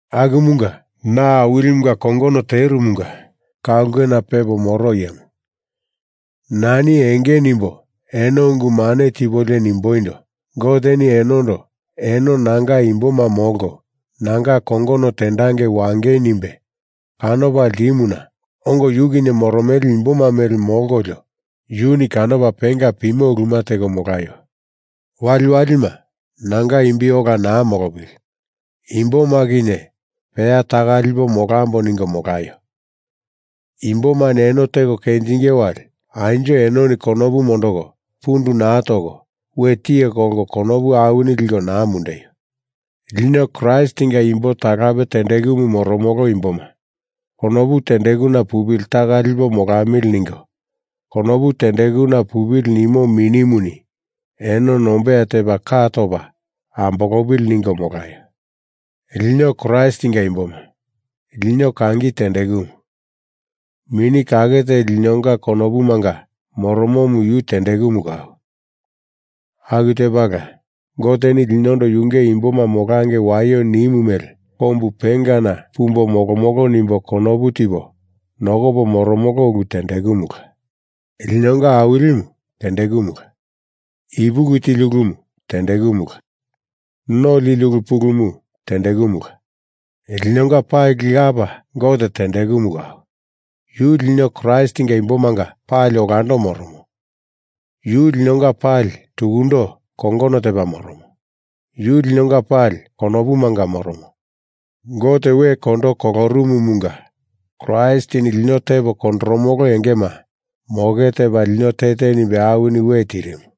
Akumunga na Awilimunga kongono terumunga ka ulkena pepo moro iyemu, nani enge nimbo eno ungu mane tipolio nimboindo Goteni enondo eno nanga imboma molko nanga kongono tendangi wangei nimbe kanopa ltimuna ongo yu kinye moromele imboma mele molkolio yuni kanopa penga pimo uluma teko molaio. Waliwalima nanga imbi ola naa molopili, imboma kinye peya taka lipo molambo ningo molaio. Imbomani eno teko kenjinge wali anjo enoni konopu mondoko pundu naa toko we tiye kolko konopu awini liko naa mundeio. Lino Kraistinga imbo talape tendekumu moromolo imboma konopu tendekuna pupili taka lipo molamili ningo konopu tendekuna pupili nimo Minimuni eno nombeya tepa ka topa ambolopili ningo molaio. Lino Kraistinga imboma, lino kangi tendekumu. Mini Kake Teli linonga konopumanga moromomu yu tendekumu kau. Aku tepala Goteni linondo yunge imboma molangei waio nimu mele kombu pengana pumbo molomolo nimbo konopu tipo nokopo moromolo ulu tendekumula. Linonga Awilimu tendekumula. Ipuki tili ulumu tendekumula. No lili ulu pulumu tendekumula. Linonga pali Lapa Gote tendekumu kau. Yu lino Kraistinga imbomanga pali olando moromo. Yu linonga pali tukundo kongono tepa moromo. Yu linonga pali konopumanga moromo. Gote we kondo kolorumumunga Kraistini lino tepo kondoromolo engema moke tepa lino te te nimbe awini we tirimu.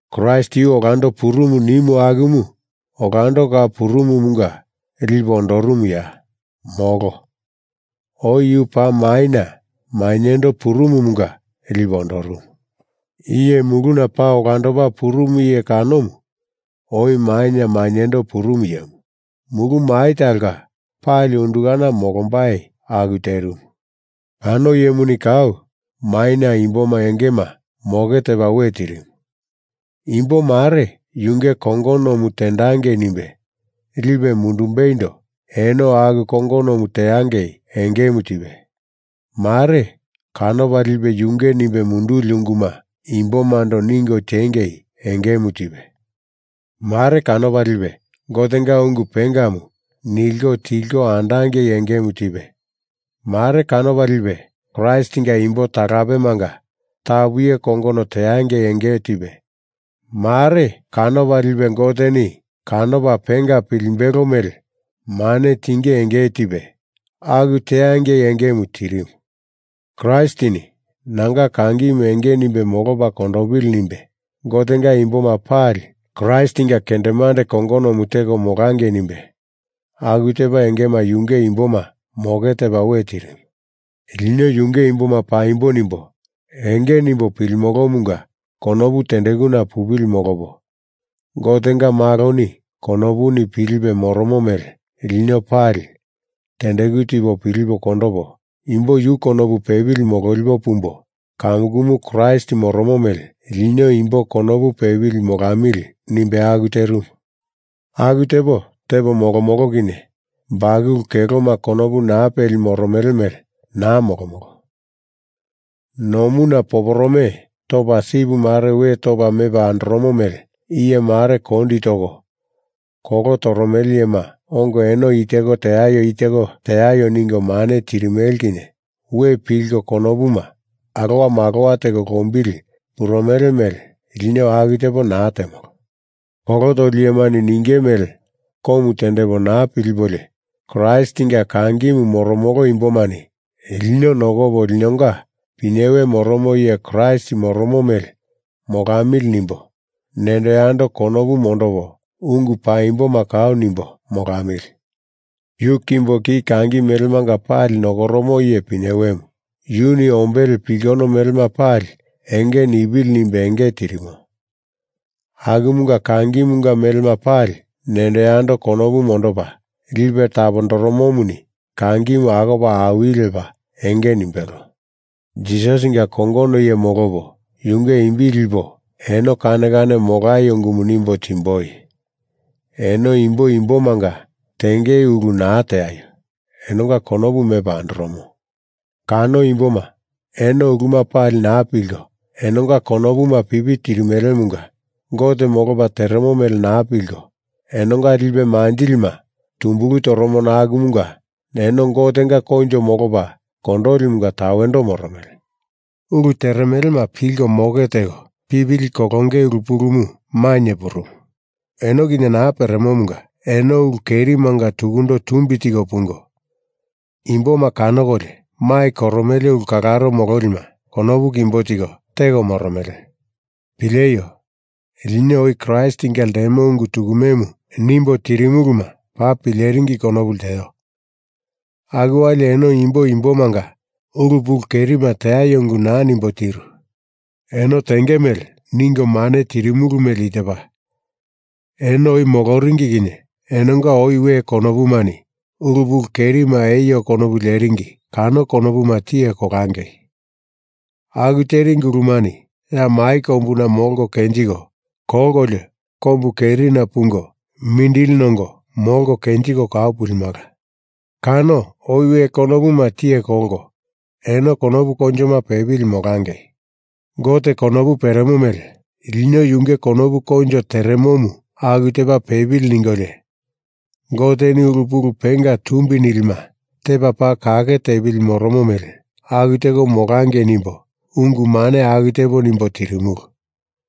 Kraist yu olando purumu nimu akumu olando kau purumumunga lipe ondorumuya? Molo. Oi yu paa maina mainyendo purumumunga lipe ondorumu. Iye muluna paa olandopa purumu iye kanomu oi maina mainyendo purumu iyemu. Mulu mai talonga pali undukana molombai aku terimu. Kano iyemuni kau maina imboma engema moke tepa we tirimu. Imbo mare yunge kongonomu tendangei nimbe lipe mundumbeindo eno aku kongonomu teangei engemu tipe, mare kanopa lipe yunge nimbe munduli unguma imbomando ningo tengei engemu tipe, mare kanopa lipe Gotenga ungu pengamu nilko tilko andangei engemu tipe, mare kanopa lipe Kraistinga imbo talapemanga tapu iye kongono teangei enge tipe mare kanopa lipe Goteni kanopa penga pilimbelo mele mane tinge enge tipe aku teangei engemu tirimu. Kraistini nanga kangimu enge nimbe molopa kondopili nimbe Gotenga imboma pali Kraistinga kendemande kongonomu teko molangei nimbe aku tepa engema yunge imboma moke tepa we tirimu. Lino yunge imboma paimbo nimbo enge nimbo pilimolomunga konopu tendekuna pupili molopo, Gotenga Maloni konopuni pilipe moromo mele lino pali tendeku tipo pilipo kondopo, imbo yu konopu pepili mololipo pumbo, kamukumu Kraist moromo mele lino imbo konopu pepili molamili nimbe aku terimu. Aku tepo tepo molomolo kinye bakulu keloma konopu naa peli moromele mele naa molomolo. Nomuna poporome topa sip mare we topa mepa andoromo mele iye mare kondi toko kolo toromele iyema ongo eno i teko teaio i teko teaio ningo mane tirimele kinye we pilko konopuma alowa malowa teko lombili purumele mele lino aku tepo naa temolo. Kolo toli iyemani ninge mele komu tendepo naa pilipolio Kraistinga kangimu moromolo imbomani lino nokopo linonga pinyewe moromo iye Kraist moromo mele molamili nimbo nendo yando konopu mondopo ungu paimboma kau nimbo molamili. Yu kimbo ki kangi melemanga pali nokoromo iye pinyewemu. Yuni ombele pulkono melema pali enge nipili nimbe enge tirimo. Akumunga kangimunga melema pali nendo yando konopu mondopa lipe tapondoromomuni kangimu akopa awili lepa enge nimbelo. Jisasinga kongono iye molopo yunge imbi lipo eno kane kane molaio ungumu nimbo timboi. Eno imbo imbomanga tenge ulu naa teaio. Enonga konopu mepa andoromo. Kano imboma eno uluma pali naa pilko enonga konopuma pipi tirimelemunga Gote molopa teremo mele naa pilko, enonga lipe manjilima tumbulu toromo akumunga eno Gotenga koinjo molopa kondolimunga tawendo moromele. Ulu teremelema pilko moke teko pipili kolonge ulu pulumu mainye purumu eno kinye naa peremomunga eno ulu kerimanga tukundo tumbi tiko pungo, imboma kanokolio mai koromele ulu kalaro mololima konopu kimbo tiko teko moromele. Pileio! Lino oi Kraistinga ltemo ungu tukumemu nimbo tirimuluma paa pileringi konopu lteo. Aku wali eno imbo imbomanga ulu pulu kerima teaio ungu naa nimbo tirulu. Eno tenge mele ningo mane tirimulu mele i tepa: Eno oi moloringi kinye enonga oi we konopumani ulu pulu kerima eio konopu leringi kano konopuma tiye kolangei. Aku teringi ulumani ya mai kombuna molko kenjiko kolkolio kombu kerina pungo mindili nongo molko kenjiko kau pulimala. Kano oi we konopuma tiye kolko eno konopu koinjoma pepili molangei. Gote konopu peremo mele lino yunge konopu koinjo teremomu aku tepa pepili ningolio Goteni ulu pulu penga tumbi nilima tepa paa kake tepili moromo mele aku teko molangei nimbo ungu mane aku tepo nimbo tirimulu.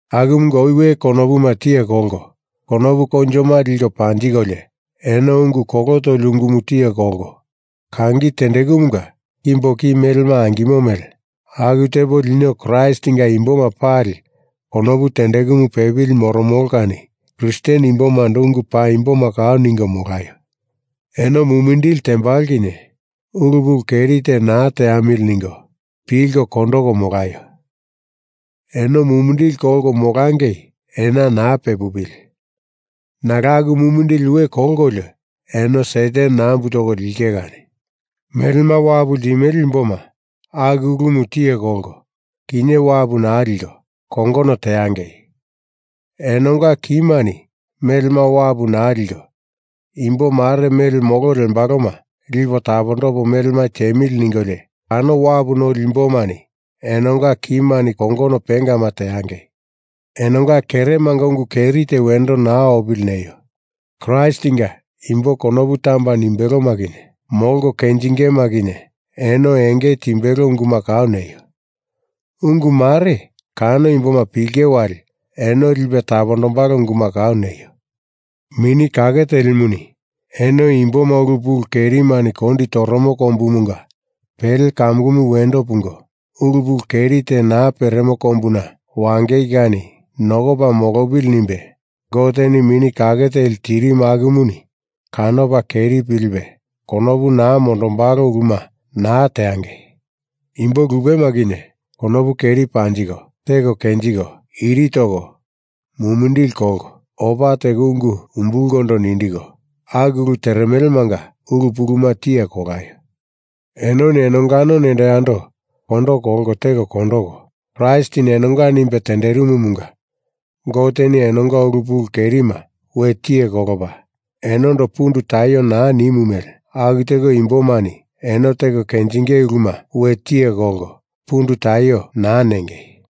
Akumunga oi we konopuma tiye kolko konopu koinjoma liko panjikolio eno ungu kolo toli ungumu tiye kolko, kangi tendekumunga kimbo ki melema angimo mele aku tepo lino Kraistinga imboma pali konopu tendekumu pepili moromolo kani Kristen imbomando ungu paimboma kau ningo molaio. Eno mumindili tembalo kinye ulu pulu keri te naa teamili. ningo, pilko kondoko molaio. Eno mumindili kolko molangei ena naa pepupili. Nalo aku mumindili we kolkolio eno Satan nambu toko linge kani. Melema wapu ltimele imboma aku ulumu tiye kolko kinye wapu naa liko, kongono teangei. Enonga kimani melema wapu naa liko imbo mare mele molo lembaloma lipo tapondopo melema tiemili ningolio kano wapu noli imbomani enonga kimani kongono pengama teangei. Enonga keremanga ungu keri te wendo naa opili neio. Kraistinga imbo konopu tamba nimbeloma kinye molko kenjingema kinye eno enge timbelo unguma kau neio. Ungu mare kano imboma pilenge wali eno lipe tapondombalo unguma kau neio. Mini Kake Telimuni eno imboma ulu pulu kerimani kondi toromo kombumunga pele kamukumu wendo pungo, ulu pulu keri te naa peremo kombuna wangei kani nokopa molopili nimbe Goteni Mini Kake Teli tirimu akumuni kanopa keri pilipe konopu naa mondombalo uluma naa teangei. Imbo lupema kinye konopu keri panjiko teko kenjiko, iri toko mumindili kolko, opa teko ungu umbulkondo nindiko, aku ulu teremelemanga ulu puluma tiye kolaio. Enoni enongano nendo yando kondo kolko teko kondoko, Kraistini enonga nimbe tenderimumunga Goteni enonga ulu pulu kerima we tiye kolopa enondo pundu taio naa nimu mele aku teko imbomani eno teko kenjinge uluma we tiye kolko pundu taio naa nengei.